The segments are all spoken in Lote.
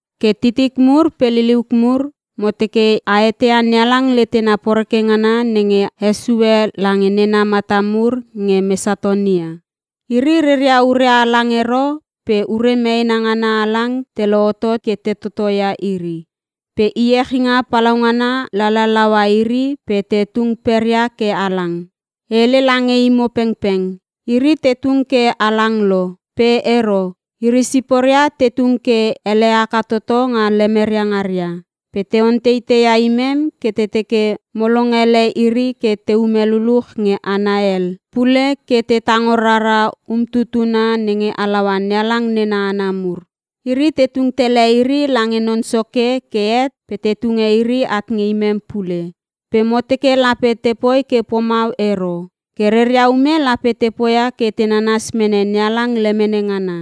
Ke titik mur pe liliuk mur, mo teke a eteia NeHalang letena poreke ngana nenge hesue lange nena mata mur nge Mesatonia. Iri reria ure halang ero pe ure meena ngana halang te lohotot ke te totoia iri. Pe iechinga palaungana lalalaua iri pe te tung peria ke halang. E hele lange imo pengpeng, iri te tung ke halang lo pe ero iri siporia te tung ke ele haka toto nga lemeria ngaria. Pe te onteiteia imem ke te teke mo longele iri ke teume luluch nge hana hel pule ke te tango rara umtutuna nenge halaua NeHalang nena hana mur. Iri te tung tele iri lange Non Soke ke het pe te tunge iri at nge imem pule, pe mo teke lape tepoi ke pomau ero. Ke reria ume lape te poia ke te nanas mene NeHalang lemene ngana.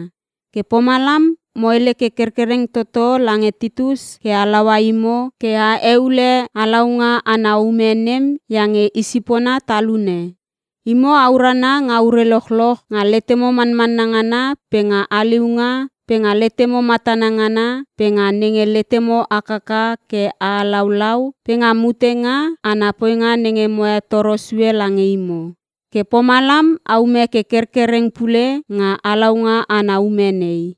Ke pomalam mo hele ke kerkereng toto lange Titus ke halaua imo ke a heule halaunga ana ume nem iange i sipona talune. Imo a urana nga ure lochloch, nga letemo manmanna ngana pe nga haliunga pe nga letemo matana ngana pe nga nenge letemo hakaka ke a halaulau, pe nga mutenga ana poinga nenge mo hetoro sue lange imo. Ke pomalam aume ke kerkereng pule nga halaunga ana ume nei.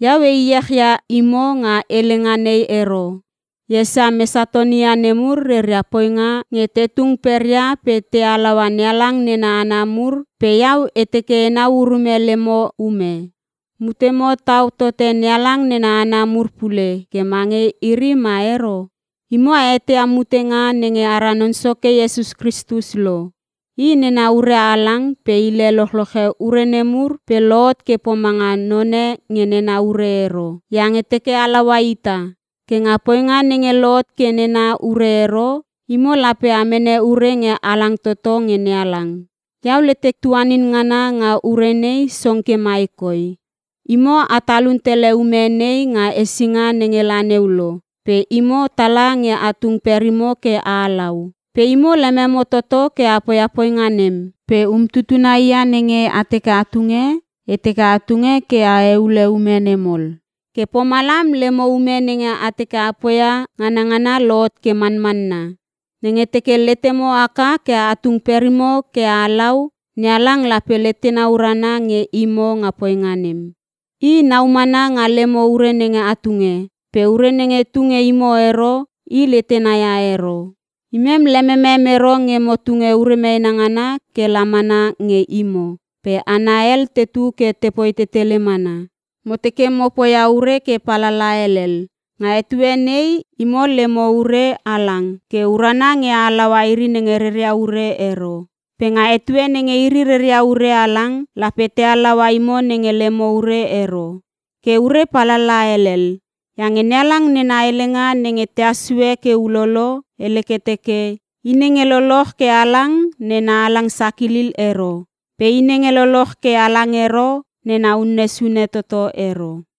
Iau e echia imo nga helenga nei ero. E esia Mesatonia nemur reria poinga nge te tung peria pe te halaua NeHalang nena hana mur pe iau e teke enau urume lemo ume. Mutemo tau tote NeHalang nena hana mur pule ke mange iri ma ero? Imo a eteia mutenga nenge ara Non Soke Iesus Kristus lo. I nena ure halang pe hile lochloche ure nemur pe lohot ke pomanga none nge nena ure ero, iange teke halaua ita. Ke nga poinga nenge lohot ke nena ure ero, imo lape a mene ure nge halang toto nge NeHalang. Iau letek tuanin ngana nga ure nei song ke mai koi: Imo a talun tele ume nei nga hesinga nenge la neu lo pe imo tala nge a tung perimo ke a halau. Pe imo lememo toto ke a poia poinga nem. Pe umtutuna hia nenge a teke a tunge, e teke a tunge ke a heule ume nem ol. Ke pomalam lemo ume nenge a teke a poia nganangana lohot ke manmanna. Nenge teke letemo haka ke a tung perimo ke a halau, NeHalang lape letena urana nge imo nga poinga nem. I nau mana nga lemo ure nenge a tunge. Pe ure nenge tu nge imo ero, I letena ia ero. Imem lememem ero nge mo tunge ure meena ngana ke la mana nge imo pe hana hel tetu ke tepoi tetele mana. Mo teke mo poia ure ke palala helel. Nga etue nei imo lemo ure halang ke urana nge a halaua iri nenge reria ure ero. Pe nga etue nenge iri reria ure halang, lape te halaua imo nenge lemo ure ero. Ke ure palala helel. Iange NeHalang nena alalaha nenge tehas sue ke ulolo, hele ke teke, “I nenge loloch ke halang nena halang sakilil ero. Pe i nenge loloch ke halang ero nena unne sune toto ero.”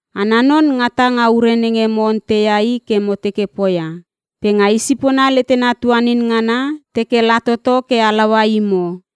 Ana non ngata nga ure nenge mo onteia i ke mo teke poia. Pe nga i sipona letena tuanin ngana teke la toto ke halaua imo.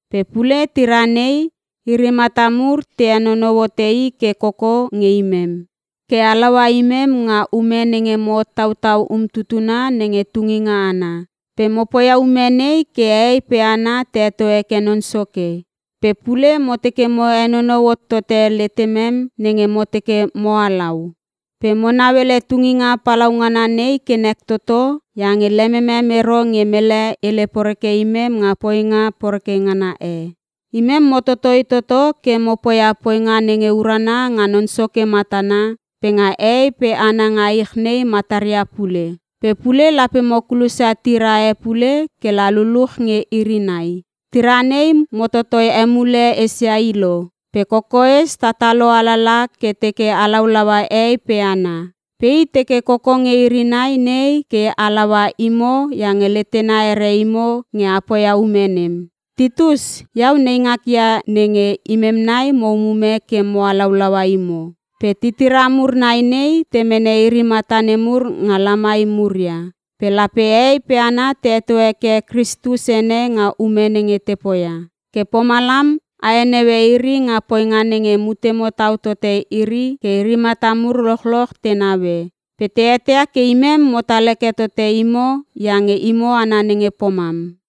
Pe pule tira nei, iri mata mur te henonou hote i ke koko nge imem, ke halaua imem nga ume nenge mo hottautau umtutuna nenge tunginga ana. Pe mo poia ume nei ke hehei pe hana te heto heke Non Soke. Pe pule mo teke mo henonou hot tote letemem nenge mo teke mo halau. Pe mo nauele tunginga palaungana nei ke nek toto iange lememem ero nge mele hele poreke imem nga poinga poreke ngana e. Imem mo totoi toto ke mo poia poinga nenge urana nga Non Soke matana pe nga hehei pe hana nga ich nei mataria pule. Pe pule lape mo kulosia tira e pule ke la luluch nge iri nai. Tira nei mo totoi emule esia i lo, pe kokoes tatalo alala ke teke halaulaua hehei pe hana. Pe i teke koko nge iri nai nei ke halaua imo iange letena here imo nge a poia ume nem. Titus, iau neingak ia nenge imem nai mo umume ke mo halaulaua imo. Pe titira mur nai nei, te mene iri mata nemur nga lamai muria. Pe lape hehei pe hana te heto heke Kristus ene nga ume nenge te poia. Ke pomalam a heneue iri nga poinga nenge mutemo tau tote iri ke iri mata mur lochloch te naue. Pe te eteia ke imem motal heke tote imo iange imo hana nenge pomam.